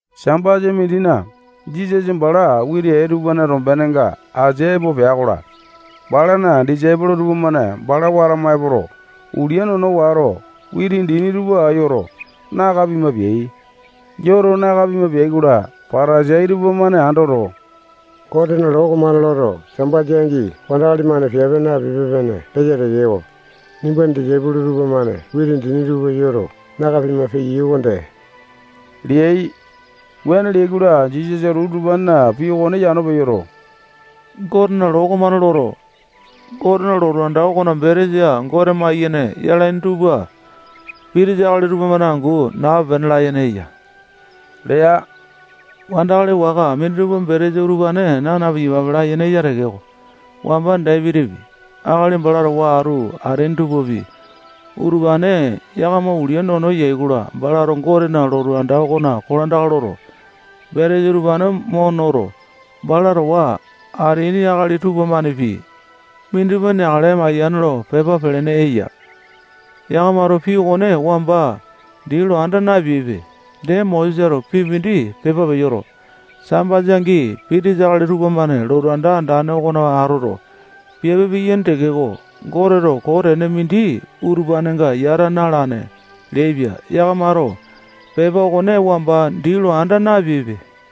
Sambasa mindina, Jisasa bala witi ee tupana tombenenga asia epo pea-kola, balana disaipolo tupamane bala watama epoto, ulia nono wato, witi dini tupa yoto, naka pima peai. Yoto naka pima peai-kola, Patasai tupamane andoto, Gotena loo okomane loto, Sambasa angi wandakali-mane piape napipe-pene leya tekeko, nimbana disaipolo tupamane witi dini tupa yoto, naka pima peyai okonde leai. Wuane leai-kola, Jisasato utupanena pii okone yano peyoto, Gotena loo okomane loto, Gotena lotu anda okona betesa Gote maiyene yalaini tupa pitisa akali tupamane angu nape-pene layene eya lea. Wandakali waka mindimane betesa utupane naa na-piyapape layene eya tekeko, wamba Dapitipi, akali bala towa atu ateaini tupapi, utupane yakama ulia nono yai-kola, balato Gotena lotu anda okonena kolandaka loto, betesa utupane noto, bala towa atu ateaini akali tupapi neakale mayane lo pepa pelene eya. Yakamato pii okone wamba dii lo anda napeaipe. Dee, Mosesato pii mindi pepa peyoto, Sambasa angi pitisa akali tupamane lotu anda andane okona atoto, piape piyaini tekeko, Goteto koo tene mindi utupanenga yata na-alane leaipia. Yakamato pepa okone wamba dii lo anda napeaipe.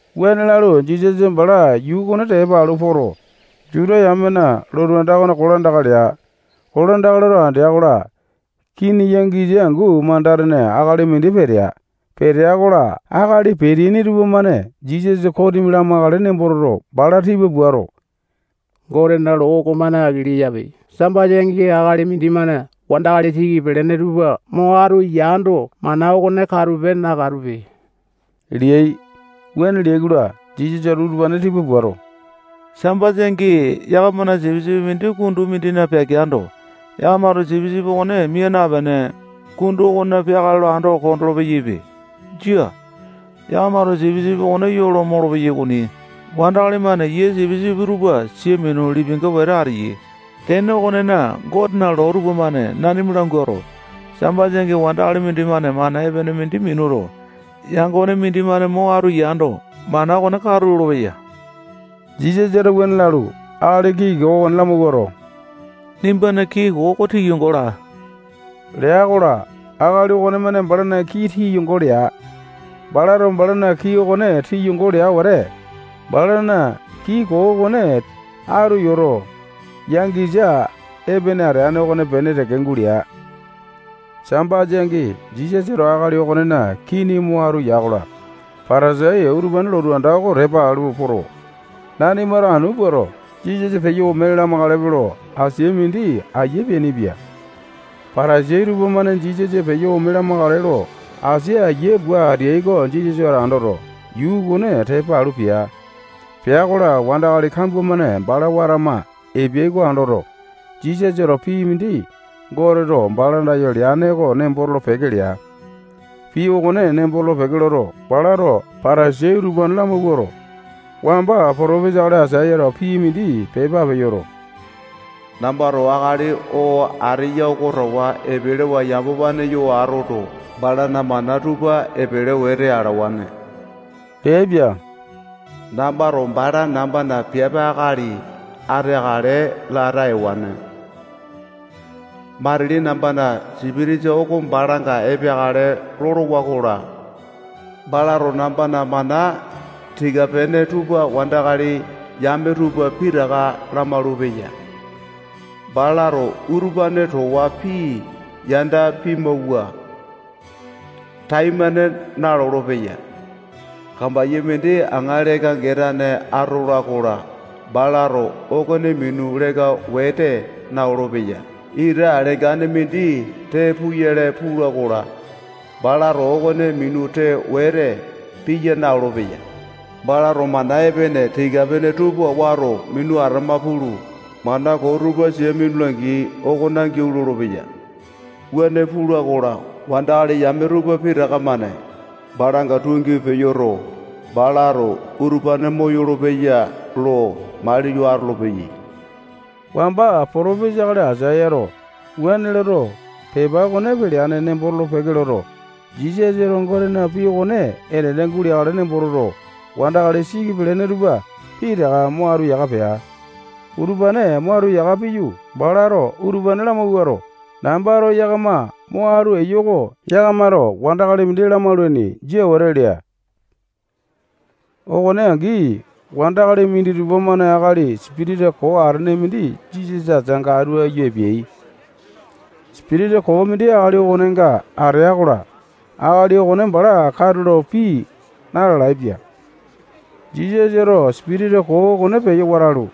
Wuane lalu, Jisasa bala yuu okone tepa alu poto, Juta yamena lotu anda okona kolandaka lea. Kolandaka loto andea-kola, kini yangisa angu manda-tene akali mindi petea. Petea-kola, akali peteaini tupamane Jisasa kosimi lamakale nembo toto, bala tipa puato, Gotena loo okomane aki leyape. Sambasa angi akali mindimane wandakali siki pelene tupa mo atu yando, mana okone katupe, nakatupe leai. Wuane leai-kola, Jisasato utupane tipa puato, Sambasa angi yakamana sipisipi mindi kundu mindina peakeando, yakamato sipisipi okone mia napene, kundu okonena yakale lo ando kondolo-peyaipe. Jia. Yakamato sipisipi okone yo lo molopeyai okoni. Wandakali-mane yia sipisipi tupa sia minu, lipinga wete ateyai. Tene okonena, Gotena loo tupamane nanima languato, Sambasa angi, wandakali mindimane mana epene mindi minuto, yangone mindi mo atu yando, mana okone katu lolopeya leya. Jisasato wuane lalu, akali kii koo okone lamawuato, nimbana kii koo oko tiyongo laa lea-kola, akali okonemane balana kii tiyongo lea. Balato balana kii okone tiyongo lea wete, balana kii koo okone atu yoto, yangisa epene ateane okopene teke gulea. Sambasa angi Jisasato akali okonena kini mo atu ya-kola, Patasai utupane lotu anda oko tepa alu poto, nanimato anu puato, Jisasa peyo ome lamakalepe lo asia mindi aiya peainipia. Patasai tupamane Jisasa peyo ome lamakale lo asia aiya pua ateai oko Jisasato andoto, yuu okone tepa alu pea. Pea-kola, wandakali kambua-mane bala watama epeyai oko andoto, Jisasato pii mindi Goteto bala andayo leane oko nembo tolo-peke lea. Pii okone nembo tolo-peke loto, balato Patasai utupane lamawuato, wamba potopesa akali Aisayato pii mindi pepa peyoto, nambato akali oo ateya oko towa epelewa yamapane yo atoto, balana mana tupa epele wete alawane leaipia. Nambato bala nambana piape akali ateakale lata ewane. Matili nambana sipitisa oko balanga epeakale lolowa-kola, balato nambana mana tika-pene tupa wandakali yame tupa pitaka lamaulu-peya. Balato utupane towa pii yanda pimawua, taimane nalolo-peya. Kambaiya mindi aŋa leka-getane atola-kola, balato okone minu leka wete na-olopeya. Ita lengane mindi tee puyale pula-kola, balato okone minu tee wete piya na-olopeya. Balato mana epene tika-pene tupa wato minu atama pulu, mana koo tupa sia minula gii okona giau lolopeya. Wuane pula-kola, wandakali yame tupa pitaka-mane balanga tungi peyoto, balato utupane moyolo-peya lo maliyo atolopeyai. Wamba potopesa akali Aisayato wuane loto, pepa okone peleane nembo tolo-peke loto, Jisasato Gotena pii okone enene guleakale nembo toto, wandakali siki pelene tupa pitaka mo atu yaka pea. Utupane mo atu yaka piyu, balato utupane lamawuato, nambato yakama mo atu eyo oko yakamato mindi wandakali lamaulaini. Jia wete lea. Okone angi wandakali minditupa-mane akali sipitisa koo atene mindi Jisasa ateanga atu aiyu epeai. Sipitisa koo mindi akali okonenga atea-kola, akali okone bala katulo pii na-lalaepia. Jisasato sipitisa koo okone peyo watalu,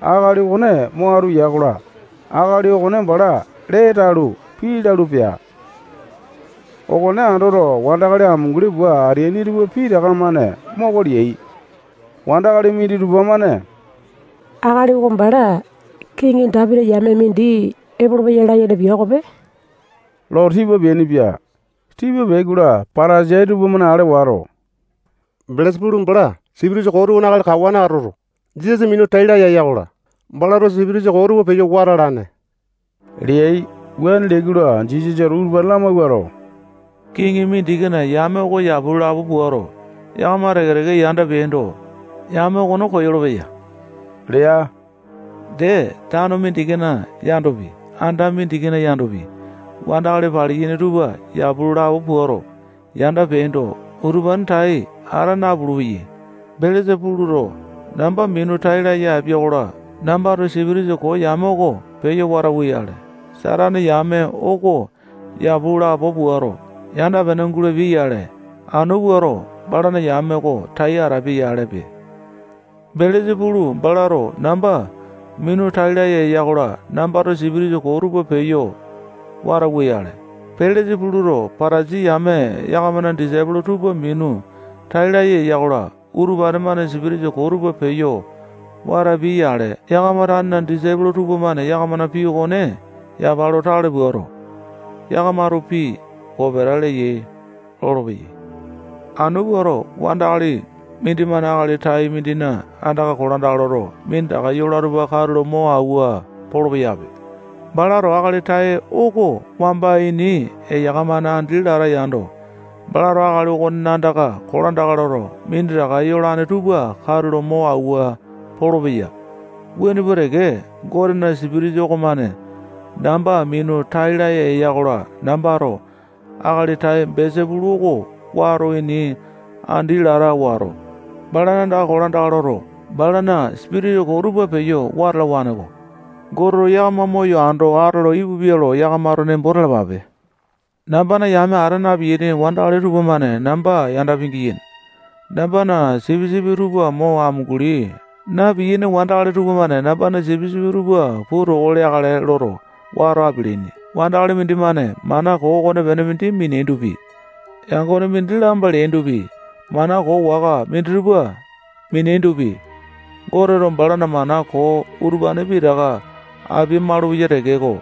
akali okone mo atu ya-kola, akali okone bala lee talu, pii lalu, pea. Okone andoto, wandakali amunguli pua ateaini tupa pitaka-mane moko leai. Wandakali minditupa-mane akali oko bala kiŋi Dapiti yame mindi epolopeya layene yene pia okope lo tipa peainipia. Tipa peai-kola, Patasai tupamane ale wato, Belesa-pulu bala sipitisa koo tupana akali kawane atoto, Jisasa minu tai laya eya-kola, balato sipitisa koo tupa peyo wata alane leai. Wuane leai-kola, Jisasato utupane lamawuato, kiŋi mindikina yame oko yapu lo lapo puato, yakama teke-teke yanda peapindo, yame okone koyolo-peya lea. Dee, tano mindikina yandopi, anda mindikina yandopi, wandakali paliyaini tupa yapu lo lapo puato, yanda peapindo, utupane tai ata napulu-peyai. Belesa-puluto namba minu tai laya apia-kola, nambato sipitisa koo yame oko peyo watauwa-yale, Satane yame okone yapu lo lapo puato, yanda-pene gulapia-yale, anu puato balana yame oko tai atapia-yalepe. Belesa-pulu balato namba minu tai laya eya-kola, nambato sipitisa koo tupa peyo watauwa-yale, Belesa-puluto Patasai yame yakamana disaipolo tupa minu tai laya eya-kola, utupane-mane sipitisa koo tupa peyo watapiai-yale. Yakama tanena disaipolo tupamane yakamana pii okone yapa lo tale puato, yakamato pii kopeta leyai lolopeyai. Anu puato, wandakali mindimane akali tai mindina andaka kolandaka loto, minditaka yola tupa katulo mo awua polo-peyape. Balato akali tai oko wamba ini eyaka-mane andi lata yando, balato akali okonena andaka kolandaka loto, minditaka yolane tupa katulo mo awua polopeya. Wuane pua teke, Gotena Sipitisa okomane namba minu tai laya eya-kola, nambato akali tai Belesa-pulu oko wamba ini andi lata wato, balana andaka kolandaka loto, balana sipitisa koo tupa peyo wata alawane-ko. Goteto yakama moyo ando atolo ipupia lo yakamato nembo talapape. Nambana yame ata na-piyaini wandakali tupamane namba yanda pingiyaini. Nambana sipisipi tupa mo amunguli na-piyaini wandakali tupamane nambana sipisipi tupa puu toko leakale loto, wata apialaini. Wandakali mindimane mana koo okonepene mindi miniandopi, yangone mindi lamba leandopi, mana koo waka minditupa mineandopi, Goteto balana mana koo utupane pitaka apia-malupeya tekeko,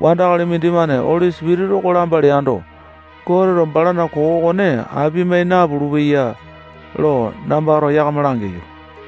wandakali mindimane Oli Sipitisa oko lamba leando, Goteto balana koo okone apia-mai napulu-peya lo nambato yakama langeyo.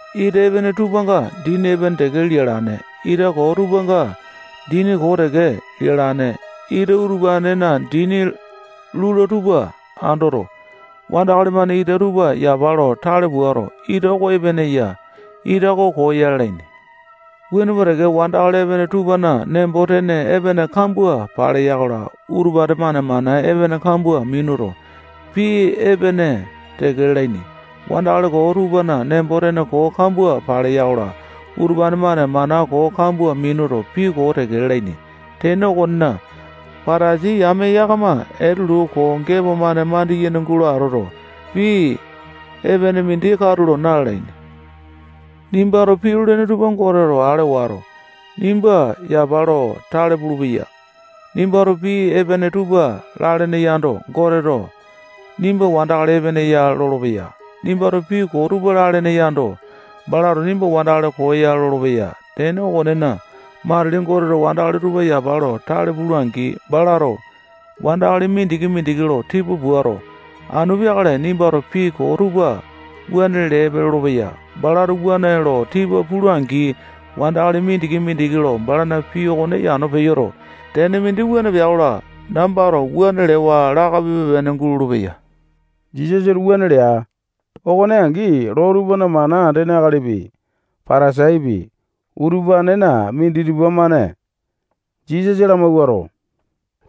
Ita epene tupanga dini epene teke lialane. Ita koo tupanga dini koo teke lialane. Ita utupanena dini lula tupa andoto, wandakali-mane ita tupa yapa lo tale puato, ita oko epene ya, ita oko koo ya lalaini. Wuane pua teke, wandakali epene tupana nembo-tene epene kambua paleya-kola, utupane-mane mana epene kambua minuto, pii epene teke lalaini. Wandakali koo tupana nembo-tene koo kambua paleya-kola, utupane-mane mana koo kambua minuto, pii koo teke lalaini. Tene okonena, Patasai yame yakama etelu koo gepo-mane mandiyene gulene atoto, pii epene mindi katulo na-lalaini. Nimbato pii lolene tupa Goteto ale wato, nimba yapa lo tale pulupeya. Nimbato pii epene tupa lalene yando, Goteto nimba wandakali epene ya lolopeya. Nimbato pii koo tupa lalene yando, balato nimba wandakali koo ya lolopeya. Tene okonena, matili Goteto wandakali tupa yapa lo tale pula-angi, balato wandakali mindiki-mindiki lo tipa puato, anu peakale nimbato pii koo tupa wuane leepe lolopeya. Balato wuane lo tipa pula-angi, wandakali mindiki-mindiki lo balana pii okone yano peyoto, tene mindi wua pea-kola, nambato wuane lewa lape-pene gulolo-peya. Jisasato wuane lea. Okone angi, loo tupana mana andene akalipi, Patasaipi, utupanena minditupa-mane Jisasa lamawuato,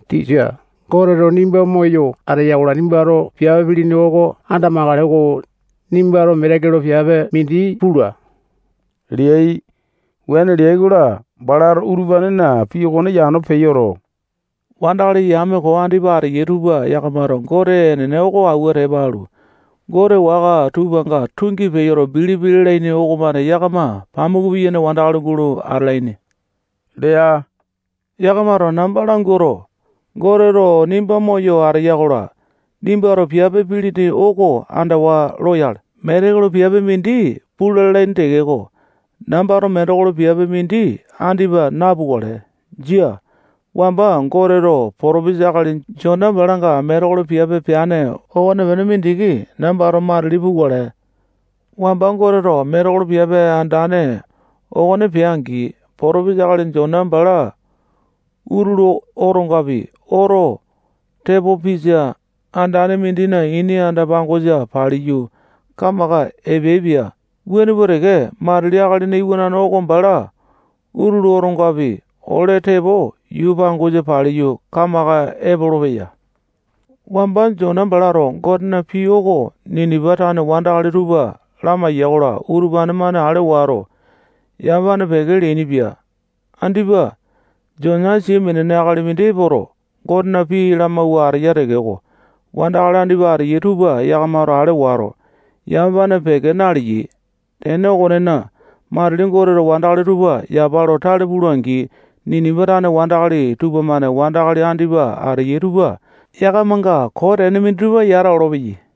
tisa, Goteto nimba moyo ateya-kola, nimbato piape pilini oko andamakale-ko. Nimbato metekolo piape mindi pula leai. Wuane leai-kola, balato utupanena pii okone yano peyoto, wandakali yame koo andipa ateyai tupa yakamato Gote enene oko awua tepa alu, gote waka tupanga tungi peyo bilipi lalaini okomane yakama pamuku piyaini wandakali gulo atalaini lea. Yakamato namba languato, Goteto nimba moyo ateya-kola, nimbato piape pilini oko andawa loyale, metekolo piape mindi pula lalaini tekeko, nambato metekolo piape mindi andipa napukale. Jia. Wamba Goteto potopesa akali Jona balanga metekolo piape peane okonepene mindiki nambato matili pukale. Wamba Goteto metekolo piape andane okone pea-angi, Potopesa akali Jona bala utulu otongapi oto tepo pisa andane mindina ini anda-pangosa paliyu, kamaka epeaipia. Wuane pua teke, matili Akalina Iwanane oko bala utulu otongapi ole tepo yuu pangosa paliyu, kamaka epolopeya. Wamba Jona balato Gotena pii oko Ninipa tane wandakali tupa lamaiya-kola, utupane-mane ale wato, yamapane peke leainipia. Andipa Jona sia minene akali mindi epoto, Gotena pii lamawua ateya tekeko, wandakali andipa ateyai tupa yakamato ale wato, yamapane peke naleyai. Tene okonena, matili Goteto wandakali tupa yapa lo tale pula-angi, Ninipa tane wandakali tupamane wandakali andipa ateyai tupa yakamanga koo tene minditupa yata olopeyai.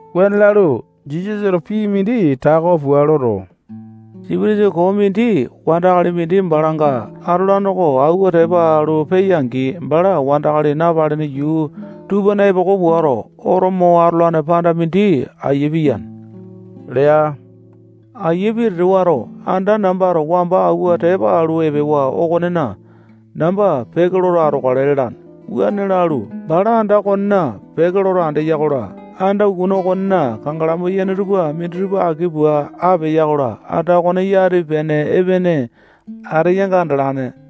Wuane lalu, Jisasato pii mindi tako pua loto, sipitisa koo mindi wandakali mindi balanga atolane oko awua tepa alu peya-angi, bala wandakali napalene yuu tupana epoko puato, oto mo atolane panda mindi aiya piyane lea. Aiya pitete wato, anda nambato wamba awua tepa alu epewa okonena namba peke loto atokale lalane. Wuane lalu, bala anda okonena peke loto andeya-kola, anda ukuna okonena kangalamu yane tupa mindimane aki pua apea-kola, anda okone yati pitane epene ateyanga andalane.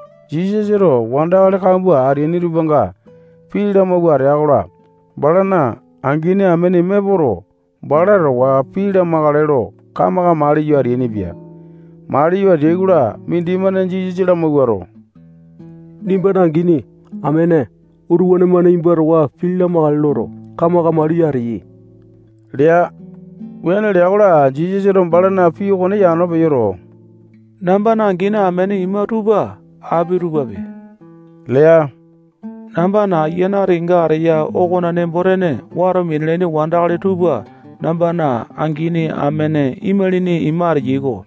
Jisasato wandakali kambua ateaini tupanga pii lamawua atea-kola, balana angini amene ima epoto, bala towa pii lamakale lo kamaka maliyo ateainipia. Maliyo ateai-kola, mindimane Jisasa lamawuato, nimbana angini, amene, utupane-mane nimba towa pii lamakale loto, kamaka maliyo ateyai lea. Wuane lea-kola, Jisasato balana pii okone yano peyoto, nambana angini amene ima tupa api tupape lea. Nambana Ayiane ati kenga ateya okona nembo-tene wato minalaini wandakali tupa nambana angini, amene, imalini, ima ateyai-ko.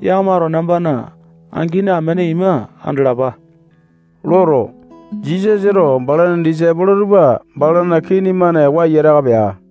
Yakamato nambana angini amene ima andalapa loto, Jisasato balana disaipolo tupa balana kii-mane waiyataka pea.